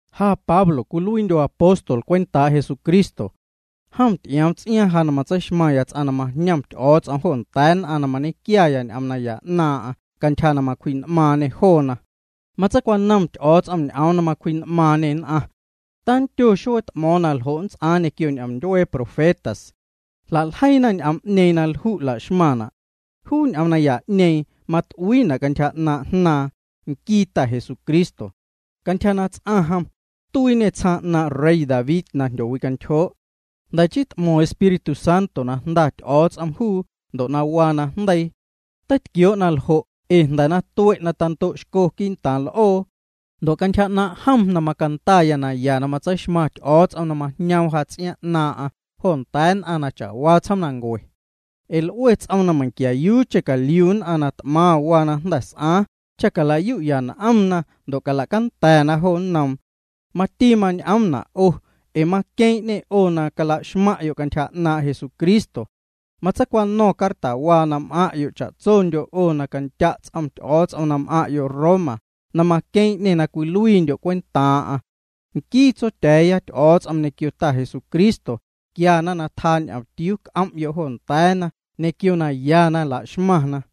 Ja Pablo cwiluiindyo̱ apóstol cwentaa' Jesucristo. Jom ty'ioom ts'iaaⁿ ja na matseixmaⁿya ts'aⁿ na majñom Ty'o̱o̱ts'om jo nda̱a̱ nn'aⁿ na nñequiaya ñ'oom naya 'naaⁿ'aⁿ cantyja na macwji'n'maaⁿñê joona. Matseicwanom Ty'o̱o̱ts'om ñ'oom na macwji'n'maaⁿñê nn'aⁿ. Tandyo xuee t'mo̱o̱ⁿ na ljo' nnts'aaⁿ ñequio ñ'omndyuee profetas. Jla'ljeiina ñ'oom'ñeeⁿ na lju' la'xmaⁿna'. Juu ñ'oom naya'ñeeⁿ mat'uiina' cantyja 'naaⁿ' Jnaaⁿ, nquii Ta Jesucristo. Cantyja na ts'aⁿ jom, tuiiñê tsjaaⁿ 'naaⁿ' rey David na jndyowicantyjoo'. Jnda̱ chii t'mo̱ⁿ Espíritu Santo na Jnda Ty'o̱o̱ts'om juu ndo' waa najndeii. Teitquioo' naljo' ee jnda̱ na tue' tando'xco quii'ntaaⁿ l'oo. Ndo' cantyja 'naaⁿ' jom macandaya naya na matseixmaⁿ Ty'o̱o̱ts'om na majñoom ja ts'iaaⁿ 'naaⁿ'aⁿ jo nda̱a̱ nn'aⁿ cha'waa tsjoomnancue. Ee l'ue ts'oom na meiⁿquiayuucheⁿ caliu nn'aⁿ na t'maⁿ waa na jnda̱ s'aaⁿ, cha cala'yu'ya n'omna ndo' cala'canda̱na jo nnoom. Mati mañ'oomna' 'o, ee maqueeⁿ'ñê 'o na cala'xmaⁿ'yo' cantyja 'naaⁿ' Jesucristo. Matseicwano̱ⁿ cartawaa na m'aⁿ' cha'tsondyo' 'o na candya' ts'om Ty'o̱o̱ts'om na m'aⁿ'yo' Roma, na maqueeⁿ'ñê na cwiluiindyo' cwentaaⁿ'aⁿ. Nquii Tsotya̱a̱ya Ty'o̱o̱ts'om ñequio Ta Jesucristo quiana na tjaa ñomtiuu c'om'yo' jo nda̱a̱na ñequio naya na laxmaⁿna.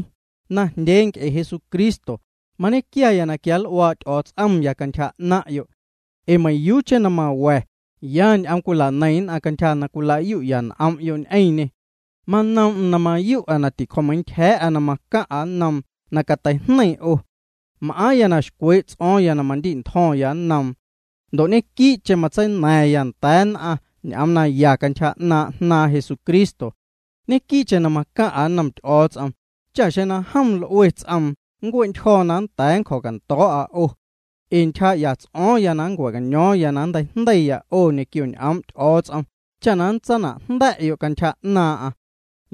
Najndyee nc'e Jesucristo, mañequiaya na quianl'uaa' Ty'o̱o̱ts'omya cantyja 'naⁿ'yo'. Ee meiⁿyuucheⁿ na mawa̱ya, ya ñ'oom cwila'neiⁿ nn'aⁿ cantyja na cwila'yu'ya ñ'om'yo' ñ'eⁿñê. Manoom'm na mayu'a na ticjo̱meintyja̱a̱'a na macaⁿ'a nnoom na cateijneiⁿ 'o. M'aaⁿya na xcwee' ts'o̱o̱ⁿya na mandi'ntjo̱ⁿya nnoom. Ndo' ñequii'cheⁿ matseina̱ⁿya nda̱a̱ nn'aⁿ ñ'oom naya cantyja 'naaⁿ' Jnaaⁿ Jesucristo. Ñequii'cheⁿ na macaⁿ'a nnom Ty'o̱o̱ts'om cha xeⁿ na jom l'ue ts'oom nncue'ntyjo̱ na nnda̱a̱ nncjo̱cando̱o̱'a 'o. Ee ntyjaa'ya ts'o̱o̱ⁿya na nncua̱'caño̱o̱ⁿya na nnteijndeiya 'o ñequio ñ'oom' Ty'o̱o̱ts'om cha nntsana'jnda̱'yo' cantyja 'naaⁿ'aⁿ.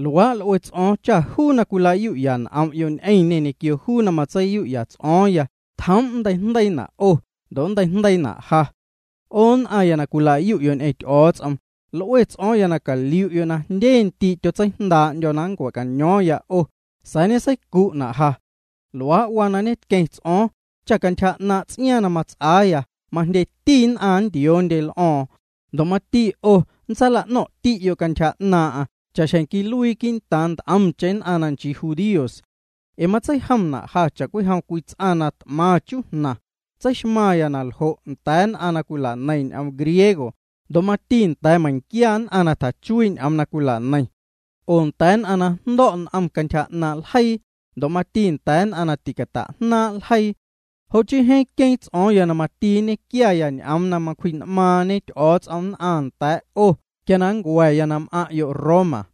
Luaa' l'ue ts'o̱o̱ⁿ cha juu na cwilayu'ya n'om'yo' ñ'eⁿñê ñequio juu na matseiyu'ya ts'o̱o̱ⁿya tjoom' nnteijndeiina' 'o ndo' nnteijndeiina' ja. 'O nn'aⁿya na cwila'yu'yo' ñ'eⁿ Ty'o̱o̱ts'om, l'ue ts'o̱o̱ⁿ na caliu'yo' na jndye ndii' tyotseijndaa'ndyo̱ na nncua̱'caño̱o̱ⁿya 'o, sa̱a̱ ñeseicu'na' ja. Luaa' waa na ñetqueⁿ ts'o̱o̱ⁿ, cha cantyja 'naaⁿ' ts'iaaⁿ na nnts'aaya majndyeti nn'aⁿ nntioondye l'o̱o̱ⁿ, ndo' mati 'o nntsaala'no̱ⁿ'ti'yo' cantyja 'naaⁿ'aⁿ cha'xjeⁿ quiluii quii'ntaaⁿ nt'omcheⁿ nn'aⁿ na nchii judíos. Ee matseijomna' ja cha'cwijom cwii ts'aⁿ na t'maⁿ chujnaⁿ, tseixmaⁿya na ljo' nda̱a̱ nn'aⁿ na cwila'neiⁿ ñ'oom griego, ndo' mati nda̱a̱ meiⁿquia nn'aⁿ na tjachuii' ñ'oom na cwila'neiⁿ. Oo nda̱a̱ nn'aⁿ na jndo̱' n'om cantyja 'naaⁿ' ljeii, ndo' mati nda̱a̱ nn'aⁿ na ticata'jnaaⁿ' ljeii. Jo' chii jeeⁿ queeⁿ ts'o̱o̱ⁿya na mati nñequiaya ñ'oom na macwji'n'maaⁿñe Ty'o̱o̱ts'om nn'aⁿ nda̱a̱ 'o quia na nncua̱ya na m'aⁿ'yo' Roma.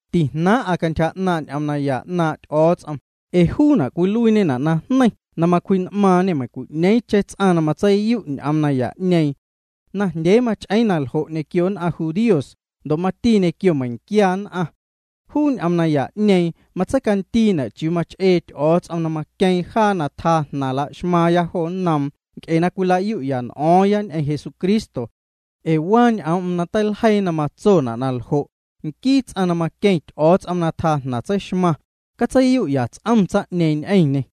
Tijnaaⁿ'a cantyja 'naaⁿ' ñ'oom naya 'naaⁿ' Ty'o̱o̱ts'om, ee juuna' cwiluiiñena' najneiⁿ na macwji'n'maaⁿñê meiⁿcwi'ñeeⁿcheⁿ ts'aⁿ na matseiyu' ñ'oom naya'ñeeⁿ. Najndyee mach'eeⁿ na ljo' ñequio nn'aⁿ judíos ndo' mati ñequio meiⁿquia nn'aⁿ. Juu ñ'oom naya'ñeeⁿ matseicandiina' chiuu mach'ee Ty'o̱o̱ts'om na maqueeⁿ jaa na tjaa jnaⁿ laxmaaⁿya jo nnoom nc'e na cwila'yu'ya n'o̱o̱ⁿya ñ'eⁿ Jesucristo. Ee waa ñ'oom'm na teiljeii na matsona' na ljo': “Nquii ts'aⁿ na maqueⁿ Ty'o̱o̱ts'om na tjaa jnaⁿ tseixmaⁿ, catseiyu'ya ts'om tsaⁿ'ñeeⁿ ñ'eⁿñê.”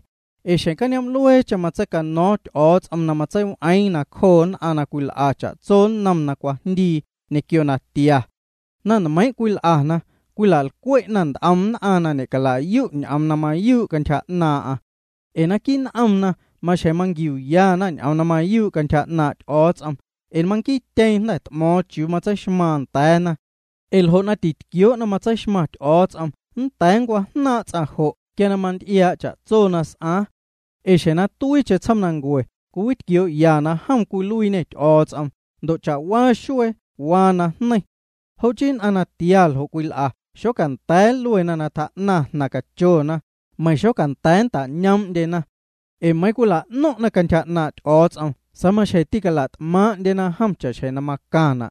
Ee xjeⁿ cañoom'lueecheⁿ matseicano̱o̱ⁿ Ty'o̱o̱ts'om na matseiw'eeⁿ nacjoo nn'aⁿ na cwil'a cha'tso nnom na cwajndii ñequio natia. Na nmeiiⁿ' cwil'ana, cwila'lcwe'na nt'om nn'aⁿ na ñe'caliu ñ'oom na mayuu' cantyja 'naaⁿ'aⁿ. Ee naquii' n'omna maxjeⁿ manquiuyana ñ'oom na mayuu' cantyja 'naaⁿ' Ty'o̱o̱ts'om ee manquiityeeⁿ jnda̱ t'mo̱o̱ⁿ chiuu matseixmaaⁿ nda̱a̱na. Ee ljo' na titquioo' na matseixmaⁿ Ty'o̱o̱ts'om nnda̱a̱ nncwajnaaⁿ' ts'aⁿ jo' quia na manty'iaa' cha'tso na s'aaⁿ. Ee xjeⁿ na tuiicheⁿ tsjoomnancue cwiwitquioo'ya na jom cwiluiiñê Ty'o̱o̱ts'om ndo' cha'waa xuee waa na jneiⁿ. Jo' chii nn'aⁿ natia ljo' cwil'a xocanda̱a̱ nluena na tjaa'naⁿ jnaⁿ cachona, meiⁿ xocanda̱a̱ nta'ñoom'ndyena. Ee meiiⁿ na cwila'no̱ⁿ'na cantyja 'naaⁿ' Ty'o̱o̱ts'om sa̱a̱ maxjeⁿ tîcala't'maaⁿ'ndyena jom cha'xjeⁿ na macaⁿna'.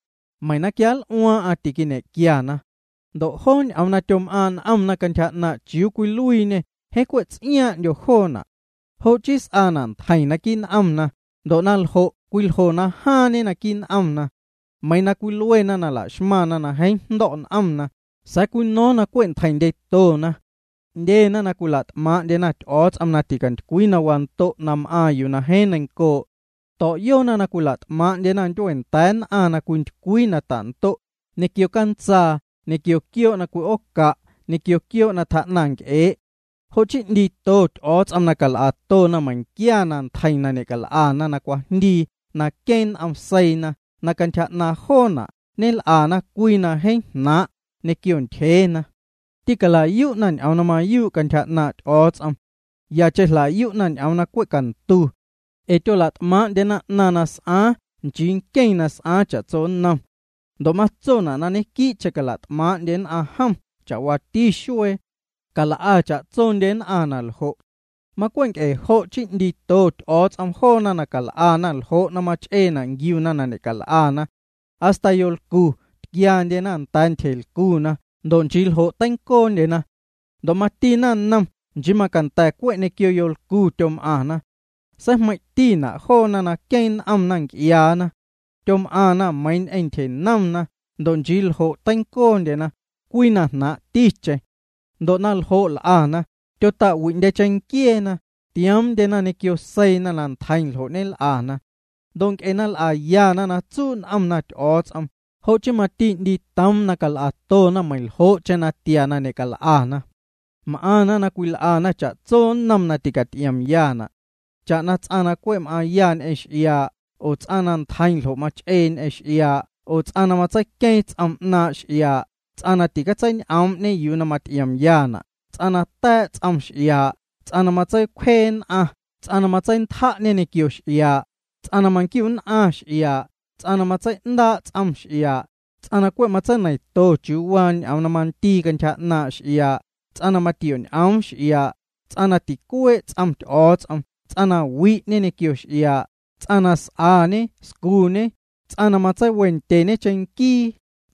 Meiⁿ na quianl'uaaⁿ'aⁿ tiñe'nquiana. Ndo' joo ñ'oom na tyom'aaⁿ' n'omna cantyja 'naaⁿ' chiuu cwiluiiñê jeeⁿ cwe' ts'iaaⁿ'ndyo joona'. Jo' chii s'aana' ntjeiⁿ naquii' n'omna, ndo' na ljo' cwiljo na jaaⁿñe naquii' n'omna. Meiiⁿ na cwiluena na la'xmaⁿna nn'aⁿ na jeeⁿ jndo̱' n'om, sa̱a̱ cwino̱o̱ⁿ na cwe' ntjeiⁿndyetona. 'Ndyena na cwila't'maaⁿ'ndyena Ty'o̱o̱ts'om na ticantycwii na wando' na m'aaⁿ yuu na jeeⁿ neiⁿncoo'. To̱'yoona na cwila't'maaⁿ'ndyena ndyueenda̱a̱ nn'aⁿ na cwintycwii na ta'ndo', ñequio cantsaa ñequio quioo' na cwi'ooca' ñequio quioo' na tjaa'naⁿ nc'ee'. Jo' chii 'ndiito Ty'o̱o̱ts'om na cal'atona meiⁿquia na ntjeiⁿ na ñe'cal'ana na cwajndii na queeⁿ n'om seiina na cantyja 'naaⁿ joona' ñel'ana cwii na jeeⁿ jnaaⁿ' ñequio ntyjeena. Tîcala'yu'na ñ'oom na mayuu' cantyja 'naaⁿ' Ty'o̱o̱ts'om. Yacheⁿ jla'yu'na ñ'oom na cwe' cantu. Ee tyola't'maaⁿ'ndyena 'naⁿ na s'aaⁿ nchii nqueⁿ na s'aaⁿ cha'tso nnom. Ndo' matsona' na ñequii'cheⁿ cala't'maaⁿ'ndye nn'aⁿ jom cha'waati xuee. Cal'a cha'tsondye nn'aⁿ naljo'. Macwe' nc'e jo' chii 'ndiito Ty'o̱o̱ts'om joona na cal'ana ljo' na mach'eena' nquiuna na ñe'cal'ana. Hasta yolcu tquiandye nda̱a̱ ntyjelcu ndo' nchii ljo' teincoondyena. Ndo' mati naⁿnom nchii macanda̱ cwe' ñequio yolcu tyom'aⁿna. Seijmeiⁿ'tina' joona na queeⁿ n'omna nc'iaana. Tyom'aⁿna meiiⁿ ñ'eⁿ ntyjenomna, ndo' nchii ljo' teincoondyena, cwii na jnaaⁿ'ticheⁿ. Ndo' na ljo' l'ana, tyota'wi'ndye cheⁿnquieena, tioomndyena ñequio seiina na ntjeiⁿ ljo' ñel'ana. Ndo' nc'e na l'ayana na tsuu' n'omna Ty'o̱o̱ts'om, jo' chii mati 'ndiitoom na cal'atona meiⁿljo'cheⁿ natia na ñe'cal'ana. M'aⁿna na cwil'ana cha'tso nnom na ticaty'iomyana'. Cha'na ts'aⁿ na cwe' m'aaⁿya ñ'eⁿ x'iaa', oo ts'aⁿ na ntjeiⁿ ljo' mach'ee ñ'eⁿ x'iaa' oo ts'aⁿ na matseiqueeⁿ ts'om 'naaⁿ' x'iaa', ts'aⁿ na ticatseiñ'oom'ñe yuu na maty'iomyana', ts'aⁿ na ta̱a̱' ts'om x'iaa', ts'aⁿ na matseicwjee nn'aⁿ, ts'aⁿ na matseintja'ñe ñequio x'iaa', ts'aⁿ na manquiu'nn'aⁿ x'iaa', ts'aⁿ na matsei'ndaa' ts'om x'iaa', ts'aⁿ na cwe' matseineiⁿto chiuu waa ñ'oom na mandii cantyja 'naaⁿ' x'iaa', ts'aⁿ na matioñ'oom x'iaa', ts'aⁿ na ticuee' ts'om Ty'o̱o̱ts'om, ts'aⁿ na wi'ñe ñequio x'iaa', ts'aⁿ na s'añe scuñe, ts'aⁿ na matseiwendyeñe cheⁿnquii,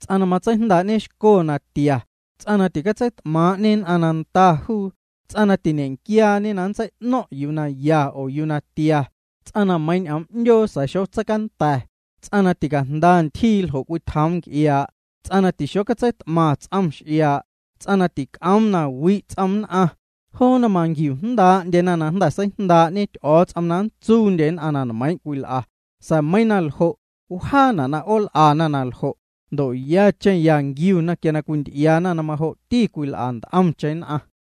ts'aⁿ na matseijndaa'ñexco natia, ts'aⁿ na ticatseit'maaⁿ'ñe nn'aⁿ na nda juu, ts'aⁿ na tiñequiaañe na nntsei'no̱ⁿ' yuu na ya oo yuu na tia, ts'aⁿ na meiiⁿ na ñ'oom 'ndyoo sa̱a̱ xocatseicanda̱, ts'aⁿ na ticajnda ntyjii ljo' cwitjoom nc'iaa', ts'aⁿ na tixocatseit'maⁿ ts'om x'iaa', ts'aⁿ na tic'oom na wi' ts'om nn'aⁿ, joona manquiujndaa'ndyena na jnda̱ seijndaa'ñe Ty'o̱o̱ts'om na nntsuundye nn'aⁿ na nmeiiⁿ' cwil'a, sa̱a̱ meiiⁿ na ljo', wjaana' na 'ool'ana na ljo', ndo' yacheⁿ ya nquiuna quia na cwinty'iaana na majo'ti cwil'a nt'omcheⁿ nn'aⁿ.